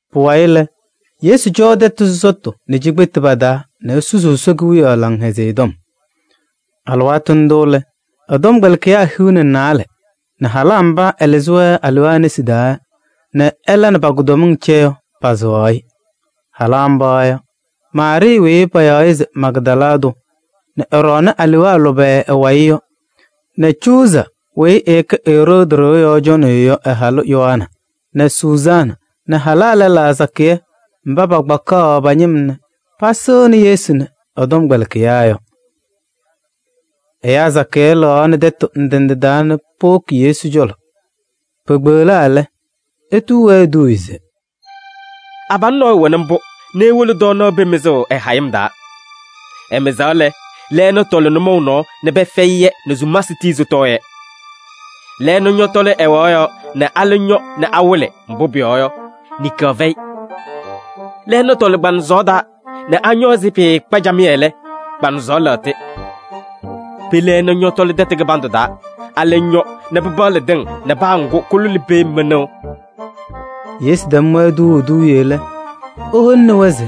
Pʋwayɩ lɛ, Yesu cɔɔ tɛtʋ sɔsɔtʋ nɛ cikpetu pa-taa nɛ esusuu Ɛsɔ Kewiyaɣ Laŋhɛzɩyɛ Tɔm. Alɩwaatʋ ndʋ lɛ, ɛ-tɔmkpɛlɩkɩyaa hiu nɛ naalɛ nɛ halaa mba ɛɛlɩzɩ-wɛ alewaa nesi taa nɛ ɛla nɛ pa-kʋdɔmɩŋ cɛ yɔ pasɩɣaɣ-ɩ. Halaa mba yɔ: Maarɩɩ weyi payaɣ se Magdala tʋ nɛ ɛɛɖɔɔnɩ alewaa lʋbɛ ɛ-wayɩ yɔ nɛ Cuuza weyi ɛkɛ Eroodi ɖɩɣa yɔɔ cɔnɩyʋ yɔ ɛ-halʋ Yoana nɛ Sʋzaana nɛ halaa lɛlaa sakɩyɛ mba pakpakaɣ pa-ñɩm nɛ pasɩŋnɩ Yesu nɛ ɛ-tɔmkpɛlɩkɩyaa yɔ. Ɛyaa sakɩyɛ lɩɣaɣnɩ tɛtʋ ndɩ ndɩ taa nɛ powoki Yesu cɔlɔ. Pekpeɣlaa lɛ, etuu-wɛ eduuye se: “Abalʋ nɔɔyʋ wɛnɩ mbʋ nɛ ewolo tɔɔnaɣ pee mɩzʋʋ ɛ-hayɩm taa. Ɛmɩzaɣ lɛ, lɛɛna tɔlɩ nʋmɔʋ nɔɔ nɛ pɛfɛyɩ-yɛ nɛ sumasɩ tii sɩtɔɔ-yɛ. Lɛɛna ñɔtɔlɩ ɛwaɣ yɔɔ nɛ alɛ ñɔ nɛ awɩlɩ, mbʋ pʋyɔɔ yɔ, niŋkaɣ fɛyɩ. Lɛɛna tɔlɩ kpaŋsɔɔ taa nɛ añɔ ɛzɩ pɩɩkpa camɩyɛ lɛ, kpaŋsɔɔ lɛɣtɩ. Pee lɛɛna ñɔtɔlɩ tɛtʋ kɩbandʋ taa, alɛ ñɔ nɛ pɩpaɣlɩ tɩŋ nɛ paa ŋgʋ kʋlʋlɩ pee mɩnʋʋ.” Yesu tɛm-wɛ tuuu eduuye lɛ, eholini-wɛ se: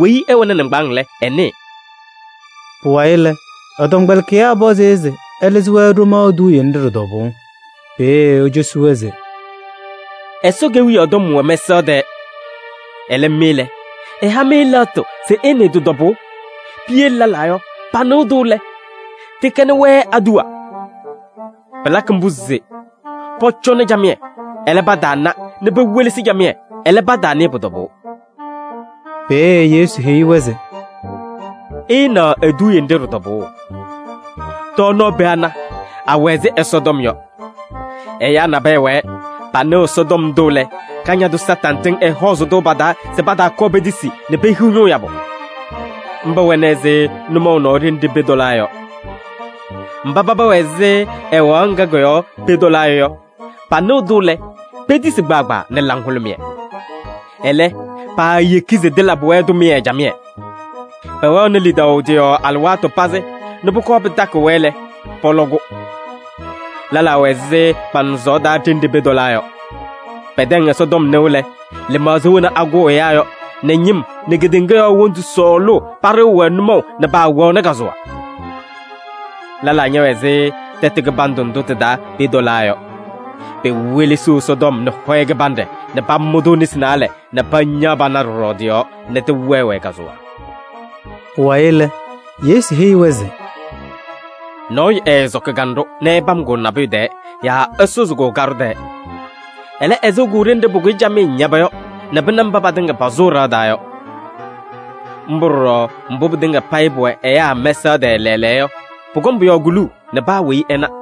“Weyi ɛwɛnɩ nɩŋgbaaŋ lɛ, ɛnɩɩ.” Pʋwayɩ lɛ, ɛ-tɔmkpɛlɩkɩyaa pɔzɩ-ɩ se ɛlɩzɩ-wɛ ɖomaɣ eduuye nɖɩ ɖɩ-tɔbʋʋ. Peeye ecosi-wɛ se: “Ɛsɔ Kewiyaɣ tɔm wɛ mɛsaɣ tɛɛ. Ɛlɛ mɩ lɛ, ɛha-mɩ lɛɣtʋ se ɩnɩɩ tɩ-tɔbʋʋ. Piyele lɛlaa yɔ, panɩɣ-tʋ lɛ, tɩkɛnɩ-wɛ aduwa. Pɩlakɩ mbʋ se: ‘Pɔcɔnɩ camɩyɛ, ɛlɛ, pataana nɛ pewelesi camɩyɛ, ɛlɛ, pataanɩɩ pʋ-tɔbʋʋ.’” Peeye Yesu heyi-wɛ se: “Ɩɩnaɣ eduuye nɖɩ ɖɩ-tɔbʋʋ: tɔɔnaɣ pee ana, awɛ ɛzɩ Ɛsɔtɔm yɔ. Ɛyaa nabɛyɛ wɛɛ, panɩɣ Ɛsɔtɔm ndʋ lɛ, Kañadʋ Satanɩ tɩŋ ɛhɔɔzɩ-tʋ pa-taa se pataakɔɔ petisi nɛ pehiɣ ñʋʋ yabʋ. Mba wɛnɩ ɛzɩ nʋmɔʋ nɔɔ ɖenɖe pee tɔlaa yɔ. Mba paba wɛ ɛzɩ ɛwaɣ ŋga kɔ-yɔɔ pee tɔlaa yɔ, panɩɣ-tʋ lɛ, petisi kpaagbaa nɛ laŋhʋlʋmɩyɛ. Ɛlɛ, paayeki se tɩlabɩ-wɛ tʋmɩyɛ camɩyɛ. Pɛwɛɣnɩ lidaʋ tɩ-yɔɔ alɩwaatʋ pazɩ nɛ pʋkɔɔ pɩtakɩɣ-wɛ lɛ, pɔlɔ-kʋ. Lɛlaa wɛ ɛzɩ kpaŋsɔɔ taa ɖenɖe pee tɔlaa yɔ. Pɛtɛŋ Ɛsɔtɔm nɩʋ lɛ, lɩmaɣza wena akʋʋ ɛyaa yɔ nɛ ñɩm nɛ kedeŋa yɔɔ wondu sɔɔlʋʋ paɖɩɣ-wɛ nʋmɔʋ nɛ paawɛɣnɩ kazʋwa. Lɛlaa ñɛwɛ ɛzɩ tɛtʋ kɩbandʋ ndʋ tɩ-taa pee tɔlaa yɔ. Pewelesiɣ Ɛsɔtɔm nɛ hɔyɛ kɩbanɖɛ nɛ pamʋ-tʋ nesi naalɛ nɛ pañaɣ pana pɔɖɔ tɩ-yɔɔ nɛ tɩwɛɛ-wɛ kazʋwa.” Pʋwayɩ lɛ, Yesu heyi-wɛ se: “Nɔɔyʋ ɛɛsɔkɩ kanɖʋ nɛ ɛpam-kʋ nabʋyʋ tɛɛ yaa ɛsʋzɩ-kʋ kaɖʋ tɛɛ. Ɛlɛ, ɛsɩɣ-kʋ ɖenɖe pʋkʋyɩ camɩyɛ ñaba yɔ nɛ pɩna mba patɩŋa pasʋʋ ɖɩɣa taa yɔ. Mbʋ ɖɔɖɔ mbʋ pɩtɩŋa payɩ pʋwɛ ɛyaa mɛsaɣ tɛɛ lɛɛlɛɛyɔ yɔ, pʋkɔŋ pʋ-yɔɔ kuluu nɛ paa weyi ɛna.”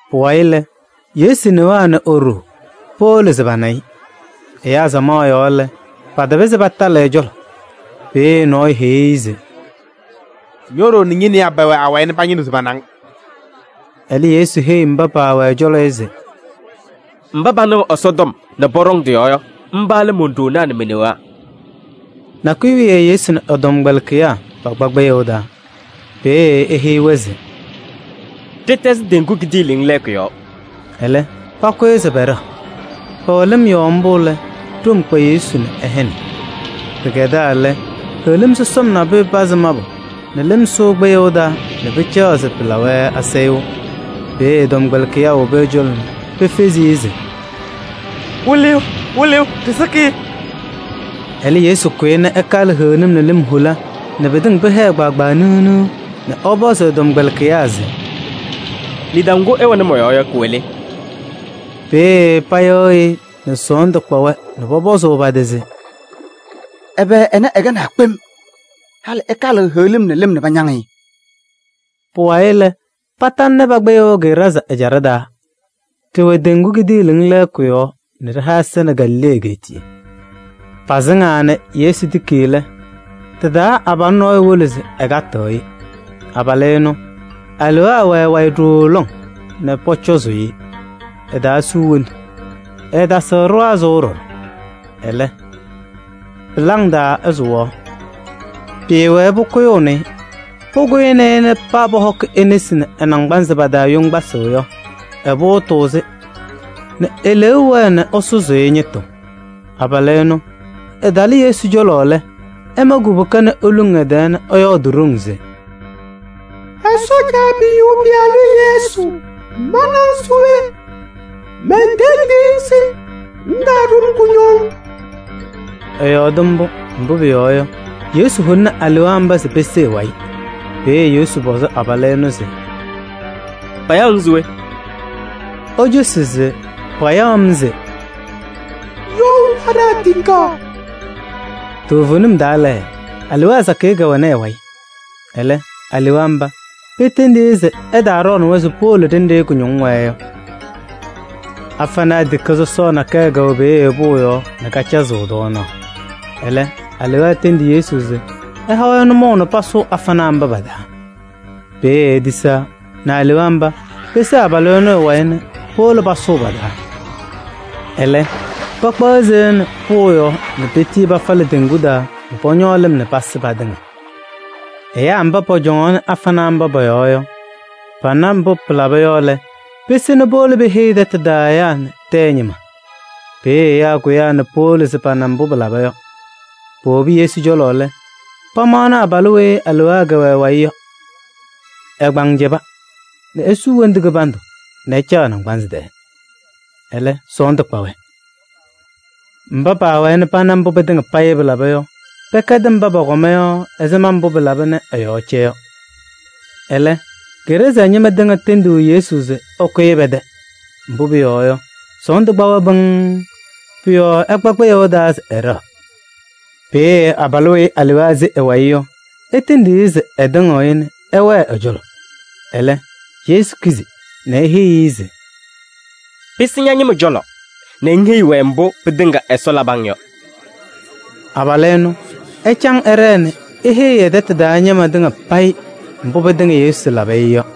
Pʋwayɩ lɛ, Yesu newaa nɛ e-ɖoo powolo se pana-ɩ. Ɛyaa samaɣ yɔɔ lɛ, patapɩzɩ patalɩ ɛ-cɔlɔ. Peeye nɔɔyʋ heyi-i se: “Ño-ɖoo nɛ ñe-newaa pɛwɛ awayɩ nɛ pañɩnɩɣ se pana-ŋ.” Ɛlɛ Yesu heyi mba pɛwɛ ɛ-cɔlɔ yɔ se: “Mba panɩɣ Ɛsɔtɔm nɛ pɔɖɔŋ tɩ-yɔɔ yɔ, mba lɛ mon-ɖoonaa nɛ me-newaa.” Nakʋyʋ wiye Yesu nɛ ɛ-tɔmkpɛlɩkɩyaa pakpa kpɩyʋʋ taa. Peeye eheyi-wɛ se: “Ɖɩtɛzɩ teŋgu kidiiliŋ lɛɛkʋ yɔɔ.” Ɛlɛ pakʋyɩ se pɛɖɛɣ. Pɛwɛ lɩm yɔɔ mbʋ lɛ, ɖom kpa Yesu nɛ ɛhɛnɩ. Pɩkɛdaa lɛ, heɣlim sɔsɔm nabʋyʋ pazɩ mabʋ nɛ lɩm sʋʋ kpɩyʋʋ taa nɛ pɩcaɣ se pɩlabɩ-wɛ asayʋʋ. Peeye ɛ-tɔmkpɛlɩkɩyaa wobi ɛ-cɔlɔ nɛ pefezi-i se: “Wɩlɩyʋ, Wɩlɩyʋ, ɖɩsɩkɩ!” Ɛlɛ Yesu kʋyɩ nɛ ɛkalɩ heɣlim nɛ lɩm hola nɛ pɩtɩŋa pɩhɛɛ kpaagbaa niɣ niɣ nɛ ɛpɔzɩ ɛ-tɔmkpɛlɩkɩyaa se: “Lidaʋ ŋgʋ ɩwɛnɩ mɔ-yɔɔ yɔ, kʋwɛ le?” Peeye payɩɣyɩ-ɩ nɛ sɔɔndʋ kpa-wɛ nɛ pɔpɔzʋʋ pa-tɩ se: “Ɛbɛ ɛnɛ ɛkɛnaa kpem? Halɩ ɛkalɩɣ heɣlim nɛ lɩm nɛ pañaŋ-ɩ!” Pʋwayɩ lɛ, patalɩnɩ pa-kpɩyʋʋ Geraazaa ɛjaɖɛ taa. Ɖɩwɛ teŋgu kidiiliŋ lɛɛkʋ yɔɔ nɛ ɖɩha ɛza nɛ Galilee egeetiye. Pasɩŋaa nɛ Yesu tiki lɛ, tɩ-taa abalʋ nɔɔyʋ wolo se ɛkatɩɣ-ɩ. Abalʋ ɛnʋ, alewaa wɛ ɛ-wayɩ ɖooo lɔŋ nɛ pɔcɔzʋʋ-ɩ. Ɛtaasuu wondu, ɛɛtasɩɣ ɖɩɣa sʋʋ ɖɔɖɔ. Ɛlɛ, pɩlaŋ taa ɛsʋwaɣ. Pɩɩwɛɛ pʋkʋyʋʋnɩ-ɩ. Pʋkʋyɩnɩ-ɩ nɛ paa pɔhɔkɩ e-nesi nɛ ɛ-naŋgbanzɩ pa-taa yoŋgbasɩ yɔ, ɛpʋʋtʋʋ-sɩ, nɛ eleeu wɛɛ nɛ ɛsʋzʋʋ-ɩ ñɩtʋ. Abalʋ ɛnʋ ɛtalɩ Yesu cɔlɔ lɛ, ɛma kubuka nɛ eluŋ ɛ-tɛɛ nɛ ɛyɔɔdɩ ɖoŋ se: “Ɛsɔ Caabiyuu Pɩyalʋ Yesu, ma nɛ ŋ se we? Mentendiɣ-ŋ se ŋtaaɖʋ-m kʋñɔŋ.” Ɛyɔɔdɩ mbʋ, mbʋ pʋyɔɔ yɔ, Yesu holini alewaa mba se pese ɛ-wayɩ. Peeye Yesu pɔzɩ abalʋ ɛnʋ se: “Payaɣ-ŋ se we?” Ecosi se payaɣ-m se: “You Laɖaa Tikaɣ.” Toovenim taa lɛ, alewaa sakɩyɛ kɛwɛnɩ ɛ-wayɩ. Ɛlɛ alewaa mba petendi-i se ɛtaaɖɔɔnɩ-wɛ se powolo ɖenɖe kʋñɔŋ wɛɛ yɔ. Afanaa tikaɣ sɔsɔɔ nakɛyɛ kɛwɛ peeye pʋʋ yɔɔ nɛ kacazɩɣ tɔɔnaɣ. Ɛlɛ alewaa tendi Yesu se ɛha-wɛ nʋmɔʋ nɛ pasʋʋ afanaa mba pa-taa. Peeye etisaa nɛ alewaa mba pese abalʋ ɛnʋ ɛ-wayɩ nɛ powolo pasʋʋ pa-taa. Ɛlɛ pakpaɣ seya nɛ pʋʋ yɔɔ nɛ petii pafalɩ teŋgu taa nɛ pɔñɔɔ lɩm nɛ pasɩ patɩŋa. Ɛyaa mba pɔcɔŋaɣnɩ afanaa mba pɔ-yɔɔ yɔ, pana mbʋ pɩlaba yɔ lɛ, pese nɛ powolo peheyi tɛtʋ taa ɛyaa nɛ tɛyɛ ñɩma. Peeye ɛyaa kʋyaa nɛ powolo se pana mbʋ pɩlaba yɔ. Powobi Yesu cɔlɔ lɛ, pamaɣnɩ abalʋ weyi alewaa kɛwɛ ɛ-wayɩ yɔ. Ɛ-kpaŋ cɛba nɛ esuu wondu kɩbandʋ nɛ ɛcaɣ ɛ-naŋgbansɩ tɛɛ. Ɛlɛ sɔɔndʋ kpa-wɛ. Mba paawɛɛ nɛ pana mbʋ pɩtɩŋa payɩ pɩlaba yɔ, pɛkɛdɩ mba pɔkɔma yɔ ɛzɩma mbʋ pɩlaba nɛ ɛ-yɔɔ cɛ yɔ. Ɛlɛ, Geraazaa ñɩma tɩŋa tendi Yesu se ɛkʋyɩ pɛ-tɛ. Mbʋ pʋyɔɔ yɔ, sɔɔndʋ kpa-wɛ pɩŋŋ. Pʋ-yɔɔ ɛkpa kpɩyʋʋ taa se ɛɖɛɣ. Peeye abalʋ weyi alewaa se ɛ-wayɩ yɔ etendi-i se ɛtɩŋɩɣ-ɩ nɛ ɛwɛɛ ɛ-cɔlɔ. Ɛlɛ, Yesu kizi nɛ eheyi-i se: “Pɩsɩ ña-ñɩma cɔlɔ nɛ ŋheyi-wɛ mbʋ pɩtɩŋa Ɛsɔ labɩ-ŋ yɔ.” Abalʋ ɛnʋ, ɛcaŋ ɛɖɛɛ nɛ eheyi ɛ-tɛtʋ taa ñɩma tɩŋa payɩ mbʋ pɩtɩŋa Yesu labɩ-ɩ yɔ.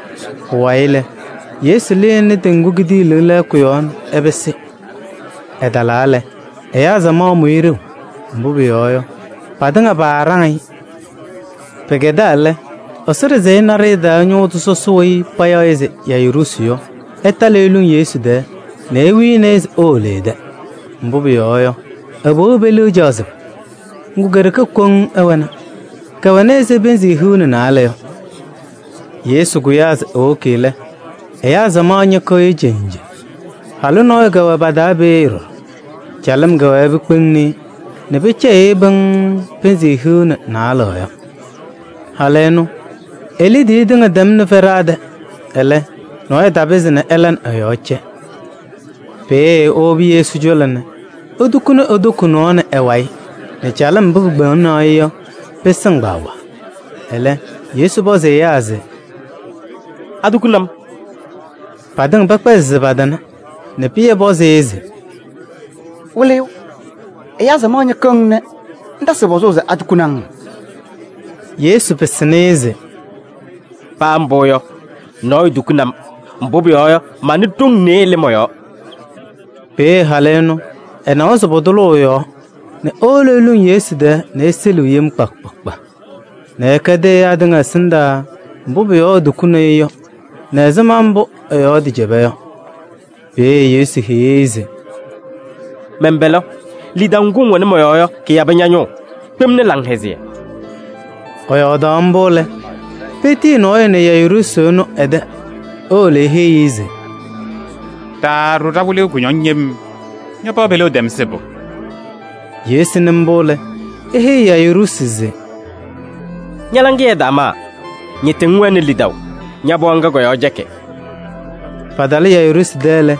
Pʋwayɩ lɛ, Yesu lɩnɩ teŋgu kidiiliŋ lɛɛkʋ yɔɔ nɛ ɛpɩsɩ. Ɛtalaa lɛ, ɛyaa samaɣ mʋ-ɩ ɖeu, mbʋ pʋyɔɔ yɔ, patɩŋa paaɖaŋ-ɩ. Pɩkɛdaa lɛ, Ɛsɔ ɖɩsɛyɛ naɖɩyɛ taa ñʋʋ tʋ sɔsɔ weyi payaɣ se Yayiruusi yɔ, ɛtalɩ eluŋ Yesu tɛɛ nɛ ewini-i se ewolo ɛ-tɛ. Mbʋ pʋyɔɔ yɔ, ɛ-pɩɣa peliɣa caɣ sɩbʋ. Ŋgʋ, ke-ɖeke koŋ ɛwɛna. Kɛwɛnɩ ɛzɩ pɩnzɩ hiu nɛ naalɛ yɔ. Yesu kʋyaa se ewoki lɛ, ɛyaa samaɣ ñɩkɩɣ-ɩ cenje. Halʋ nɔɔyʋ kɛwɛ pa-taa peeye ɖɔɖɔ. Calɩm kɛwɛɛ pikpeŋni-i nɛ pɩcɛyɩɣ-ɩ pɩŋŋ pɩnzɩ hiu nɛ naalɛ yɔ. Halʋ ɛnʋ, e-liidiye tɩŋa tɛmnɩ fɛɖaa tɛ. Ɛlɛ, nɔɔyʋ tapɩzɩ ɛla nɛ ɛ-yɔɔ cɛ. Peeye ewobi Yesu cɔlɔ nɛ etukuni e-toko nɔɔ nɛ ɛ-wayɩ nɛ calɩm mbʋ pikpeŋaɣnɩ-ɩ yɔ pɩsɩŋ kpaagbaa. Ɛlɛ Yesu pɔzɩ ɛyaa se: “Atukuni-m?” Patɩŋa pɛkpɛzɩ se patana nɛ Pɩyɛ pɔzɩ-ɩ se: “Wɩlɩyʋ! Ɛyaa samaɣ ñɩkɩɣ-ŋ nɛ ŋtasɩɣ pɔzʋʋ se atukuni-ŋ?” Yesu pɩsɩnɩ-ɩ se: “Paa mbʋ yɔ, nɔɔyʋ tukuni-m. Mbʋ pʋyɔɔ yɔ, manɩ ɖoŋ nɩɩyɩ lɩ mɔ-yɔɔ.” Peeye halʋ ɛnʋ ɛnawa se pʋtʋlʋʋ ɛ-yɔɔ, nɛ ewolo eluŋ Yesu tɛɛ nɛ eseliɣ yem kpa kpa kpa nɛ ɛkɛdɩ-ɩ ɛyaa tɩŋa ɛsɩndaa mbʋ pʋ-yɔɔ etukuni-i yɔ nɛ ɛzɩma mbʋ ɛ-yɔɔ tɩcɛba yɔ. Peeye Yesu heyi-i se: “Mɛn-pɛlɛ! Lidaʋ ŋgʋ ŋwɛnɩ mɔ-yɔɔ yɔ, kɩyabɩ ña-ñʋʋ. Kpemni laŋhɛzɩyɛ.” Ɛyɔɔdaɣ mbʋ lɛ, petiyi nɔɔyʋ nɛ Yayiruusi ɛnʋ ɛ-tɛ se ewolo eheyi-i se: “Taaɖʋ ɖa-wɩlɩyʋ kʋñɔŋ yem, ña-pɩɣa peliɣa tɛm sɩbʋ.” Yesu nɩ mbʋ lɛ, eheyi Yayiruusi se: “Ña-laŋɩyɛ ɛtaamaa, ñɩtɩ ŋwɛnɩ lidaʋ, ña-pɩɣa ŋga kɔ-yɔɔ cɛkɩ.” Patalɩ Yayiruusi tɛ lɛ,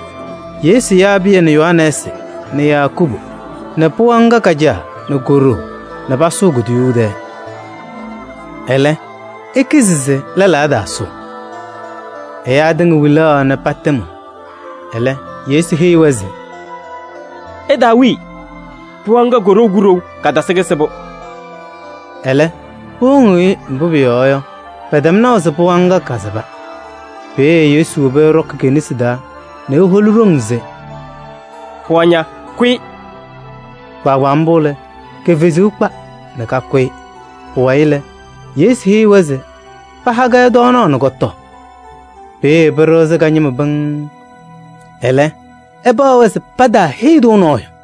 Yesu yaa Pɩyɛ nɛ Yohanɛɛsɩ nɛ Yakubu nɛ pɩɣa ŋga ka-caa nɛ ko-ɖoo nɛ pasʋʋ kuduyuu tɛɛ. Ɛlɛ, ekizi se lɛlaa ɛtaasʋʋ. Ɛyaa tɩŋa wilaɣ nɛ patɩmɩɣ. Ɛlɛ Yesu heyi-wɛ se: “Ɩtaawii! Pɩɣa ŋga, koɖou kuɖou, katɩsɩ kɩsɩbʋ.” Ɛlɛ, powoŋ-i, mbʋ pʋyɔɔ yɔ, pɛtɛm naʋ se pɩɣa ŋga kasɩba. Peeye Yesu wobi ɛɖɔkɩ ke-nesi taa nɛ eholi ɖoŋ se: “Pɩɣa ña, kʋyɩ!” Kpaagbaa mbʋ lɛ, ke-fezuu kpa nɛ kakʋyɩ. Pʋwayɩ lɛ, Yesu heyi-wɛ se paha-kɛ tɔɔnaɣ nɛ kɔtɔɔ. Peeye pɩɖɩɣzɩ ka-ñɩma pɩŋŋ. Ɛlɛ, ɛpaɣ-wɛ se pataaheyi-tʋ nɔɔyʋ.